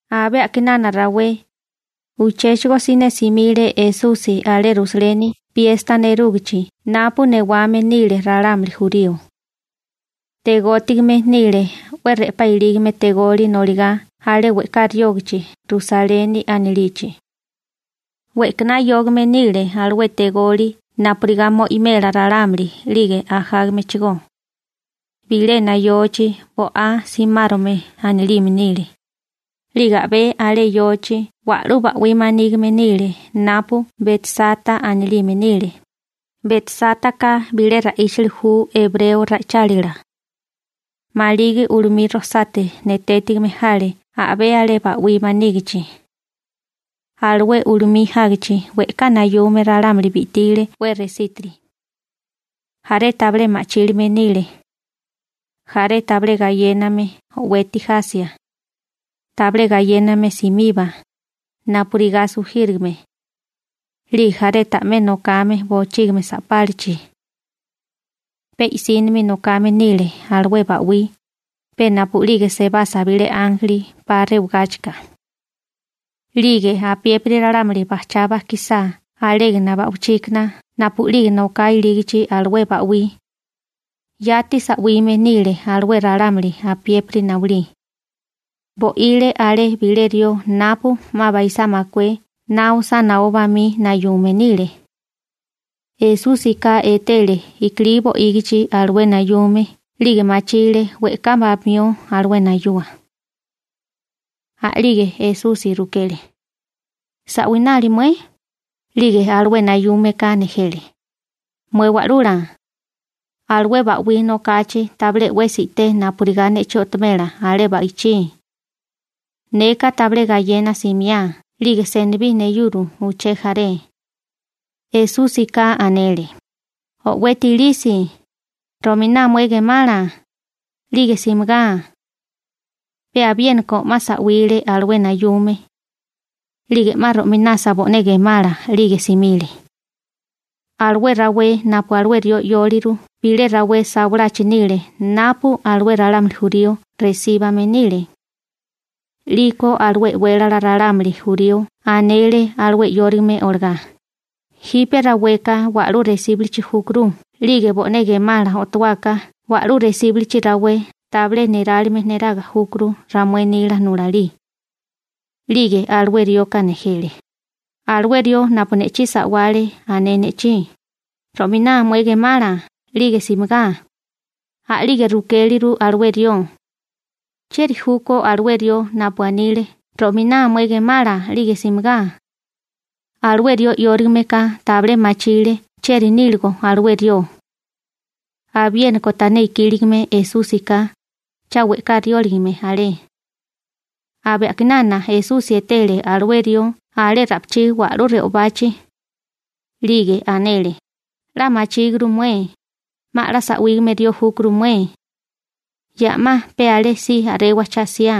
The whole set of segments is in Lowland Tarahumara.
Abé a'kinana rawé, uchéchigo siné simile Esusi alé Rusaleni piesta nerúgichi napu newame nile ralámuli jurío. Tegótigame nile 'we re'pá ilígame tegoli noligá alé we'ká riógichi Rusaleni anilichi. We'kaná yógame nile alué tegoli napurigá mo'imela ralámuli 'lige ajágamechigó. Bilena yochi Bo'á Simárome anilime nile, 'lige a'bé alé yochi wa'lú ba'wí manígime nile napu Betsata anilime nile. Betsátaka bilé ra'íchali ju ebreo ra'ichálila (o arameo ra'ichálila). Maligi ulumí rojsate netétigime jale a'bé alé ba'wí manígichi. Alué ulumí jágichi we'ká nayume ralámuli bi'tile 'we resítiri. Jaré tabilé ma'chílime nile, jaré tabilé gayéname o'weti jasia, tabilé gayéname simiba, napurigá sujírigame, 'lige jaré ta'mé nokame bochígimi sa'pálachi. Pe i'sínimi nokame nile alué ba'wí, pe napu'lige sebasa bilé ánjeli 'pa rewagáchika. 'Lige apiépiri ralámuli bajchá bajkisá alégana ba'wichíkana napu'lige noká ilígichi alué ba'wí, yati sa'wime nile alué ralámuli apiépiri nawilí. Bo'ile alé bilé rió napu 'ma baisá makué na osá naó bamí nayume nile. Esúsika etele i'kilí bo'ígichi alué nayume 'lige machile we'ká bamió alué nayua. A'lige Esusi rukele: ―¿Sa'winale mué? 'Lige alué nayúmeka nejele: ―Mué Wa'lula, alué ba'wí nokachi tabilé 'wesi i'té napurigá ne'chí o'tomela alé ba'ichí. Neka tabilé gayena simiá 'lige senibí neyuro uché jaré. Esúsika anele: ―O'weti ilisi, ro'miná mué gemala, 'lige simigá. Pe abiéniko 'ma sa'wile alué nayume. 'Lige 'ma ro'minasa bo'né gemala 'lige simile. Alué rawé napu alué rió 'yóliru bilé rawé sawalachi nile napu alué ralámuli jurío resíbame nile. 'Liko alué e'wélala ralámuli jurío anele alué 'yórigame olagá: ―Jipe raweka wa'lú resíbulichi júkuru 'lige bo'né gemala o'tuáká wa'lú resíbulichi rawé tabilé nerálime niraga júkuru ramué nila nulalí. 'Lige alué rioka nejele: ―Alué rió napu ne'chí sa'wale ané ne'chí: «Ro'miná mué gemala 'lige simigá.» A'lige rukéleru alué rió: ―¿Chieri júkó alué rió napu anile: «Ro'miná mué gemala 'lige simigá»? Alué rió 'yórigame ka tabilé machile chieri níligo alué rió. Abiéniko tané ikíligame Esúsika, cha we'ká rióligame alé. Abé a'kinana Esusi etele alué rió alé ra'pichí wa'lú re'obachi, 'lige anele: ―'La machíguru mué, 'ma 'la sa'wígame rió júkuru mué. Ya 'ma pe alé si a'rewa cha 'siá.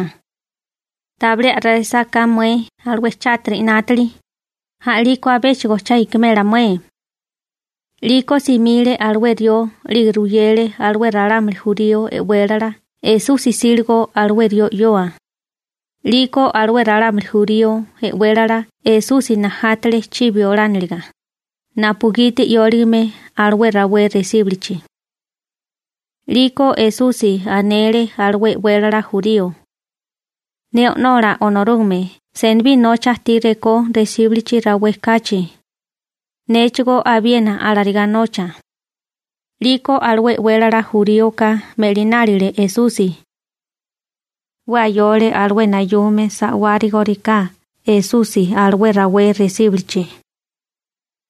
Tabilé a'resa ka mué alué chátiri 'nátili, a'liko abéchigo cha ikimela mué. 'Liko simile alué rió 'lige ruyele alué ralámuli jurío e'wélala Esusi 'síligo alué rió 'yoa. 'Liko alué ralámuli jurío e'wélala Esusi najátale chibi olániliga, napugiti 'yóligame alué rawé resíbulichi. 'Liko Esusi anele alué e'wélala jurío: ―Ne O'nola Onorúgame senibí nocha ajtí rekó resíbilichi rawé kachi, néchigó abiena alarigá nocha. 'Liko alué e'wélala juríoka me'linálile Esusi. 'We ayole alué nayume sa'wárigoriká Esusi alué rawé resíbilichi.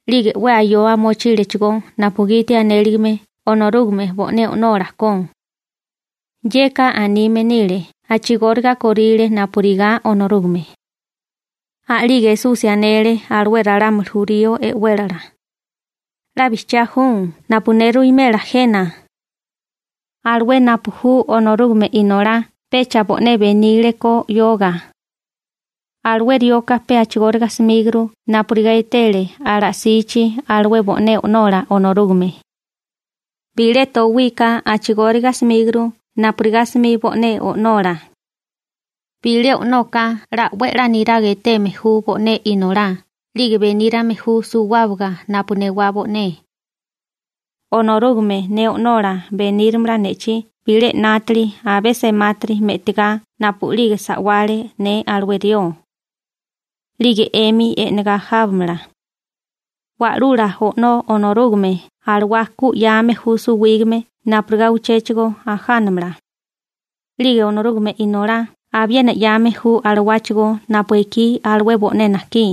'Lige 'we ayoa mochílechigó napugiti anéligame Onorúgame bo'né O'nola ko. Yeka anime nile a'chigóriga kóríle napurigá Onorúgame. A'lige Esusi anele alué ralámuli jurío e'wélala: ―'La bijchiá ju napu ne ruwimela jena. Alué napu ju Onorúgame Inolá (napu ne ju) pecha bo'né benile ko 'yoga. Alué rioka pe a'chigóriga 'smíguru napurigá etele ala'sichi alué bo'né O'nola Onorúgame. Bilé towika a'chigóriga 'smíguru napurigá 'smi bo'né o'nola. Bilé o'noka 'la 'we 'la niraga eteme ju bo'né inolá 'lige benírame ju suwábaga napu newá bo'né. Onorúgame ne o'nola benírimala ne'chí bilé 'nátili abé semátiri me'tigá napu'lige sa'wale ne alué rió. 'Lige 'emi e'negá jábamala. Wa'lula O'nó Onorúgame alawá ku 'yame ju suwígame napurigá uchéchigo ajánamala. 'Lige Onorúgame Inolá abiena 'yame ju alawáchigó napu ekí alué bo'né najkí.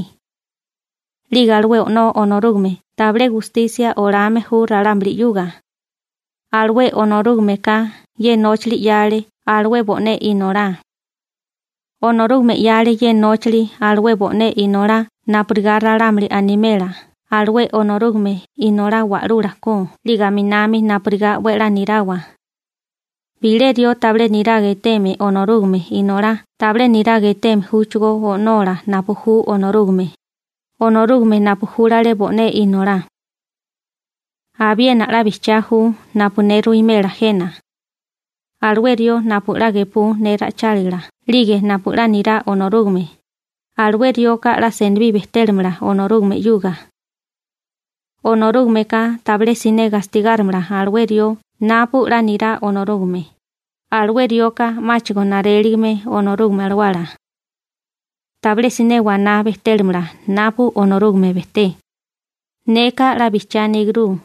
'Lige alué O'nó Onorúgame tabilé gustisia olame ju ralámuli. Alué Onorúgameka ye nóchali 'yale alué bo'né Inolá. Onorúgame 'yale ye nóchali alué bo'né Inolá napurigá ralámuli animela alué Onorúgame Inolá wa'lula ko 'lige aminami napurigá 'we a'lá nirawa. Bilé rió tabilé niraga eteme Onorúgame Inolá tabilé niraga eteme júchigó O'nola napu ju Onorúgame, Onorúgame napu júlale bo'né Inolá. › Abiena 'la bijchiá ju napu ne ruwimela jena. Alué rió napu 'la gepú ne ra'ichálila 'lige napu 'la nirá Onorúgame, alué rioka 'la senibí bejtélamala Onorúgame 'yuga. Onorúgameka tabilé siné gastigárimala alué rió napu 'la nirá Onorúgame, alué rioka 'máchigo naréligime Onorúgame Alawala. Tabilé siné waná bejtélamala napu Onorúgame bejté. Neka 'la bijchiá aníguru.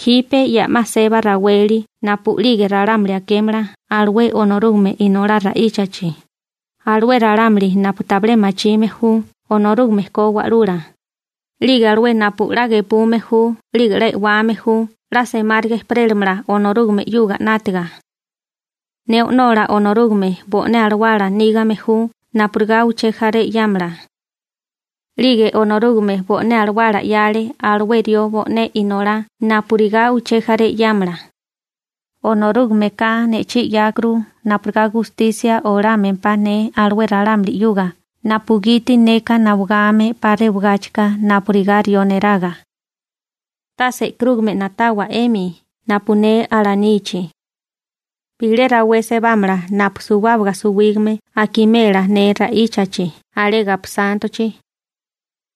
Jipe ya 'ma seba raweli napu'lige ralámuli akémala alué Onorúgame Inolá ra'íchachi, alué ralámuli napu tabilé machime ju Onorúgame ko Wa'lula, 'lige alué napu 'la gepume ju 'lige e'wame ju 'la semáriga ejperélamala Onorúgame 'yuga 'nátiga. Ne O'nola Onorúgame bo'né Alawala nígame ju napurigá uché jaré 'yámala. 'Lige Onorúgame bo'né Alawala 'yale alué rió bo'né Inolá napurigá uché jaré 'yámala. Onorúgameka ne'chí 'yákuru napurigá gustisia olámempá ne alué ralámuli napugiti neka nawagame 'pa rewagáchika napurigá rió neraga. Tase e'karúgame na'tawa 'emi napu ne alanichi. Bilé rawé sebámala napu suwábaga suwígame akimela ne ra'íchachi alé gaposántochi.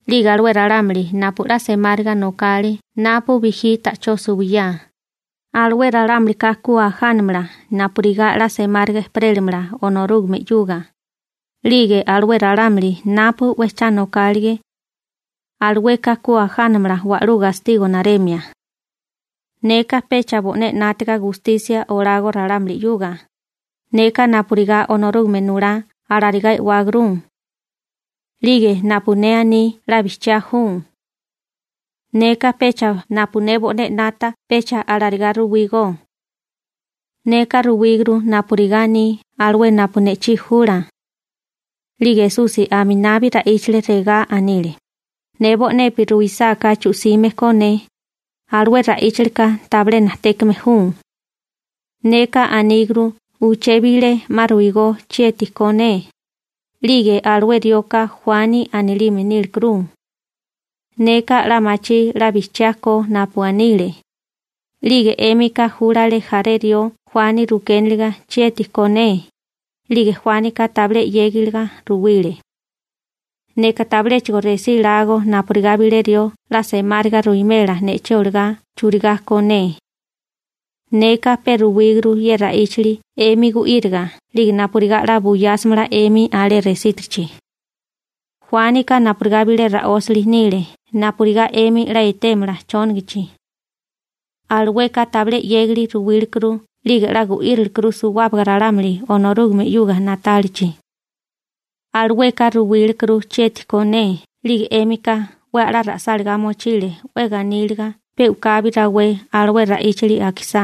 'Lige alué ralámuli napu 'la semáriga nokale napu bijí ta'chó suwiyá, alué ralámulika ku ajánamala napurigá 'la semáriga ejperélimala Onorúgame 'yuga, 'lige alué ralámuli napu 'we cha nokálige, alueka ku ajánamala wa'lú gastigo naremia. › Neka pecha bo'né 'nátiga gustisia olago ralámuli, neka napurigá Onorúgame nulá alarigá e'wáguru. 'Lige napu ne aní 'la bijchiá ju. Neka pecha napu ne bo'né 'nata, pecha alarigá ruwígó. Neka ruwíguru napurigá aní alué napu ne'chí jula. 'Lige Esusi aminabi ra'íchale, regá anile: ―Ne bo'nepi ruisáká chu'sime ko ne, alué ra'íchali ka tabilé najtékame ju. Neka aníguru uché bilé 'ma ruigó chieti ko ne, 'lige alué rioka Juani anilime nílekuru. Neka 'la machí 'la bijchiá ko napu anile. 'Lige 'émika júlale jaré rió Juani rukéniliga chieti ko ne, 'lige Juánika tabilé 'yégiga ruwile. Neka tabiléchigo resí lágó napurigá bilé rió 'la semáriga ruwimela ne'chí olagá churigá ko ne. Neka pe ruwíguru ye ra'íchali 'emi gu'íriga 'lige napurigá 'la buyásamala 'emi alé resítirichi. Juánika napurigá bilé ra'ósali nile napurigá 'emi 'la etémala chónagachi. Alueka tabilé 'yégali ruwílekuru 'lige 'la gu'írilikuru suwábaga ralámuli Onorúgame 'yuga na'tálichi. Alueka ruwílekuru chieti ko ne, 'lige 'émika 'we a'lá ra'sálagá mochile 'we ganíliga pe u'kabi rawé alué ra'íchali akisá.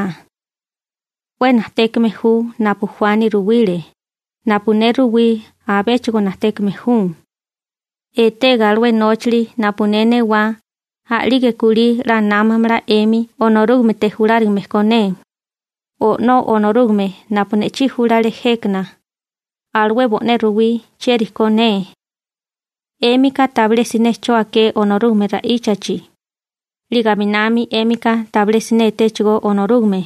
'We najtékame ju napu Juani ruwile, napu ne ruwí abéchigo najtékame ju. Etega alué nóchali napu ne newá, a'lige kulí 'la námamala 'emi Onorúgamete julárigame ko ne. O'nó Onorúgame napu ne'chí júlale jékana, alué bo'né ruwí chieri ko ne. 'Émika tabilé siné 'cho aké Onorúgame ra'íchachi, 'lige aminami 'émika tabilé siné etéchigó Onorúgame.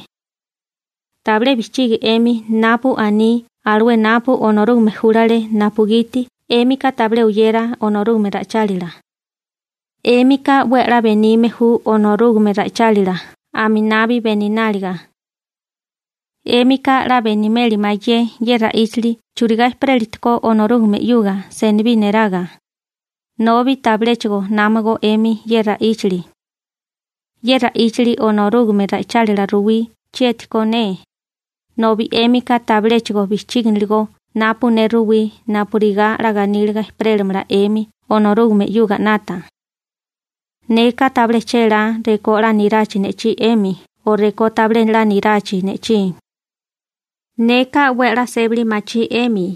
Tabilé bijchigi 'emi napu aní alué napu Onorúgame júlale napugiti 'émika tabilé oyera Onorúgame ra'ichálila. 'Émika 'we a'lá benime ju Onorúgame ra'ichálila aminabi benináliga. 'Émika 'la benimeli mayé ye ra'íchali churigá ejperélatikó Onorúgame 'yuga senibí niraga, nobi tabiléchigo námago 'emi ye ra'íchali. Ye ra'íchali Onorúgame ra'ichálila ruwí chieti ko ne, nobi 'émika tabiléchigo bijchíginiligó napu ne ruwí napurigá 'la ganíliga ejperélamala 'emi Onorúgame 'yuga 'nata. › Neka tabilé chélá rekó 'la nirachi ne'chí 'emi o rekó tabilé 'la nirachi ne'chí. Neka 'we a'lá sébali machí 'emi,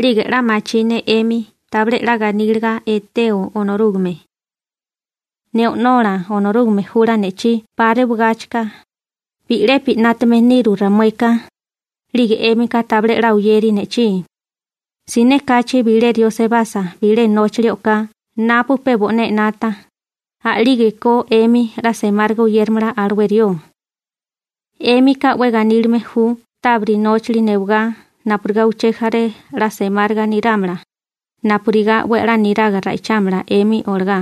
'lige 'la machí ne 'emi tabilé 'la ganíliga eteo Onorúgame. Ne O'nola Onorúgame jula ne'chí 'pa rewagáchika, bi'lepi 'nátame niru ramueka, 'lige 'émika tabilé 'la oyeri ne'chí. Siné kachi bilé rió sebasa bilé nóchali o'ká napu pe bo'né 'nata, a'lígeko 'emi 'la semáriga oyéramala alué rió. 'Émika 'we ganílime ju tabiri nóchali newigá napurigá uché jaré 'la semáriga nirámala, napurigá 'we a'lá niraga ra'ichámala 'emi olagá.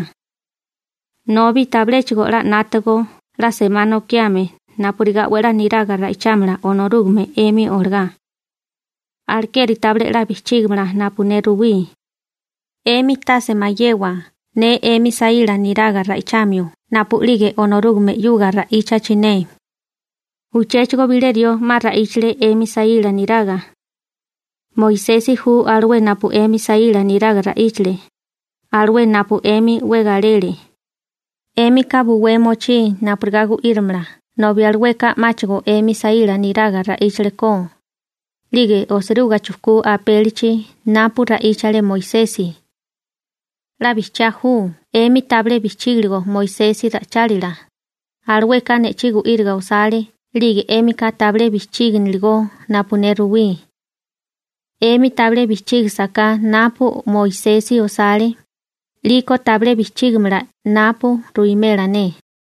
Nobi tabiléchigo 'la 'nátago 'la semá nokiame napurigá 'we a'lá niraga ra'ichámala Onorúgame 'emi olagá. Alekeri tabilé 'la bijchígamala napu ne ruwí. 'Emi tase mayewa ne 'emi saíla niraga ra'ichamio napu'lige Onorúgame 'yuga ra'íchachi ne. Uchéchigo bilé rió 'ma ra'íchale 'emi saíla niraga. Moisesi ju alué napu 'emi saíla niraga ra'íchale, alué napu 'emi 'we galele. 'Émika buwé mochí napurigá gu'írimala nobi alueka 'máchigo 'emi saíla niraga ra'íchale ko, 'lige osiruga chujkú apélichi napu ra'íchale Moisesi. 'La bijchiá ju 'emi tabilé bijchígiligo Moisesi ra'ichálila, alueka ne'chí gu'íriga osale 'lige 'émika tabilé bijchíginiligó napu ne ruwí. 'Emi tabilé bijchígasaká napu Moisesi osale, 'liko tabilé bijchígimala napu ruwimela ne.